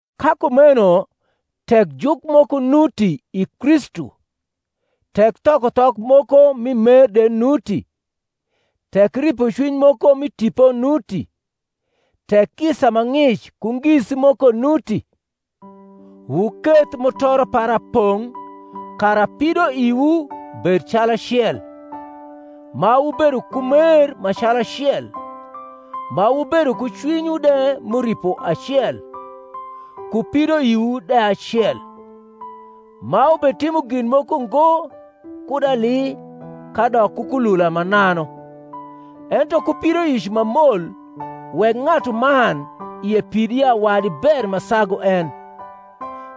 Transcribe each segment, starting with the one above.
Ka kumeno tek juk moko nuti i Kristu, tek thokothok moko mi mer de nuti, tek ripocwiny moko mi Tipo nuti, tek kisa ma ng’ic ku ngisi moko nuti, wuketh mutoro para pong’ kara pidoiwu bed calacel, ma wubedo ku mer ma calacel, ma wubedo ku cwinywu de m’uripo acel, ku pidoiwu de acel; ma wubetimo gin moko ngo kud ali kadok ku kulula mananu, ento ku pidoic ma mol wek ng’atuman ie pid ya wadi ber ma sagu en;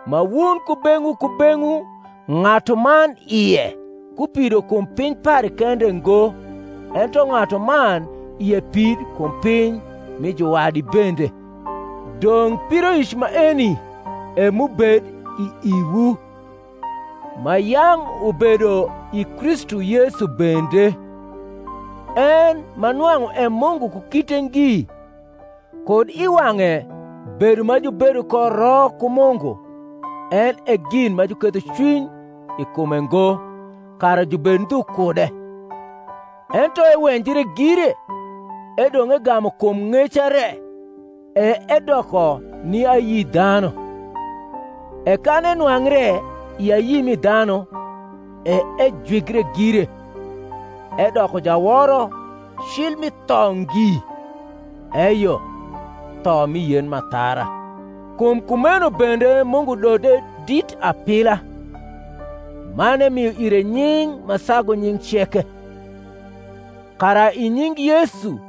ma wun kubeng’wu kubeng’wu ng’atuman ie ku pido kum piny pare kende ngo, ento ng’atuman ie pid kum piny mi juwadi bende. Dong’ pidoic maeni e m’ubed i iwu, ma yang’ ubedo i Kristu Yesu bende: en, ma nwang’u e Mungu ku kite ngi, kud i wang’e bedo ma jubedo ko ro ku Mungu en e gin ma juketho cwiny i kume ngo kara jubed ndhu kude, ento ewenjre gire, edong’ egamu kum ng’eca re, e edoko ni ayi dhanu; e kan enwangre i ayi mi dhanu, e ejwigre gire, edoko jaworo cil mi tho ngi, eyo, tho mi yen m’athara. Kum kumeno bende Mungu dode dit apila, man emio ire nying’ ma sagu nying’ ceke; kara i nying’ Yesu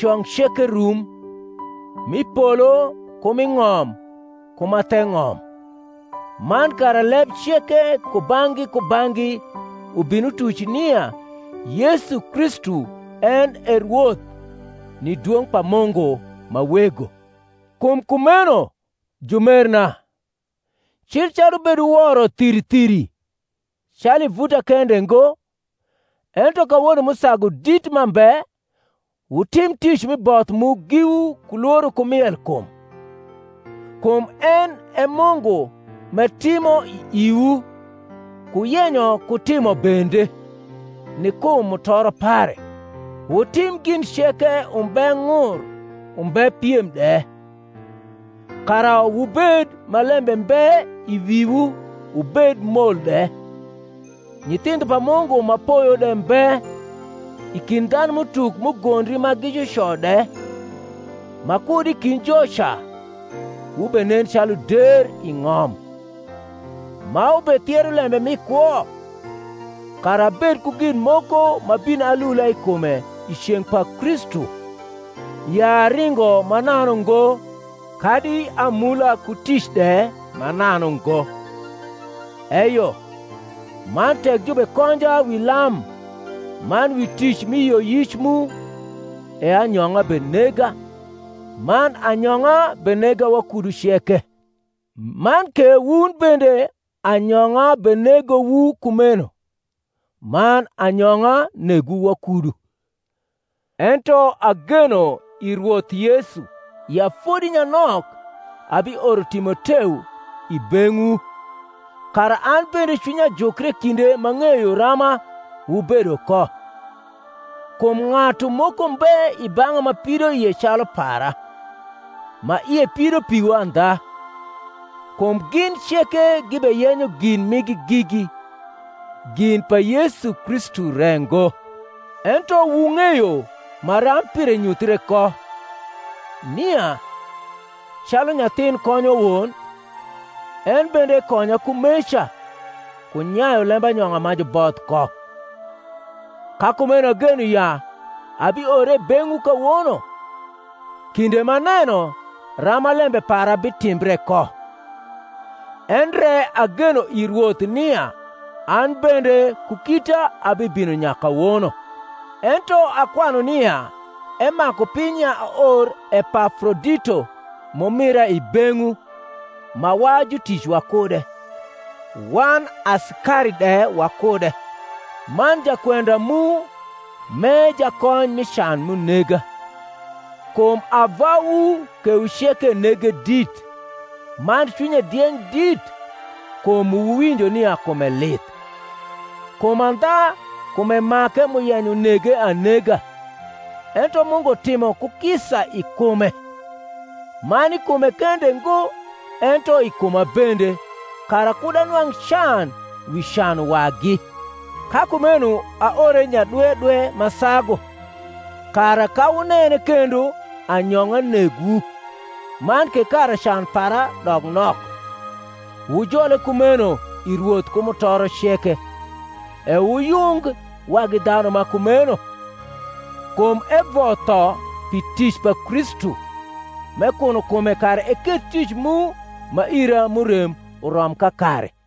cong ceke rum, m’i polo ku m’i ng’om ku ma the ng’om, man kara leb ceke kubang’gi kubang’gi ubin utuc nia Yesu Kristu en e Rwoth, ni dwong’ pa Mungu ma Wego. Kum kumeno, jumerna, cil calu wubeduworo thiri thiri, calu i vuta kende ngo, ento kawono m’usagu dit m’ambe, wutim tic mi both mu giwu ku lworo ku mielkum; kum en e Mungu m’etimo i iwu ku yenyo ku timo bende, ni kum mutoro pare. Wutim gin ceke umbe ng’ ur umbe piem de; kara wubed ma lembe mbe iwiwuwubed mol de, nyithindho pa Mungu ma poyo de mbe i kind dhanum’utuk m’ugondri ma gi juco de, ma kud i kind joca wubenen calu der i ng’om, ma wubethiero lembe mi kwo; kara abed ku gin moko m’abin alula i kume i ceng’ pa Kristu, ya aringo mananu ngo kadi amula ku tic de mananu ngo. Eyo, man tek jubekonja wi lam man wi tic mi yioyic mu, e anyong’a benega, man anyong’a benega wakudu ceke: man ke wun bende anyong’a benegowu kumeno, man anyong’a negwu wakudu. Ento ageno i Rwoth Yesu ya fodi nyanok abioro Timoteo i beng’wu, kara an bende cwinya jukre kinde m’ang’eyo rama wubedo ko. Kum ng’atu moko mbe i bang’a ma pidoie calu para, ma ie pido piwu andha. Kum gin ceke gibeyenyo gin migi gigi, gin pa Yesu Kristu re ngo. Ento wung’eyo maram pire nyuthie ko, nia, calu nyathin konyo won, en bende ekonya kumeca ku nyayu lembanyong’a ma juboth ko. Ka kumeno ageno ya abiore i beng’wu kawono, kinde m’aneno rama lembe para bitimbre ko: endre ageno i Rwoth nia an bende ku kita abibino nyakawono. Ento akwanu nia emaku piny ya aor Epafrodito m’umira i beng’wu ma wa jutic wakude, wan asikari de wakude, man jakwenda mu m’e jakony mi can m’unega; kum ava wu kewu ceke nege dit, man cwinye dieng’ dit, kum wuwinjo nia kume lith: kum andha kume make m’uyenyo nege anega: ento Mungu timo ku kisa i kume; man i kume kende ngo, ento i kuma bende, kara kud anwang’ can wi can wagi. Ka kumeno aore nyadwedwe ma sagu, kara, ka wunene kendo anyong’a negwu, man ke kara can para dok nok. Wujole kumeno i Rwoth ku mutoro ceke; e wuyung wagi dhanu ma kumeno: kum evotho pi tic pa Kristu, m’ekuno kume kara eketh tic mu ma ira m’urem urom kakare.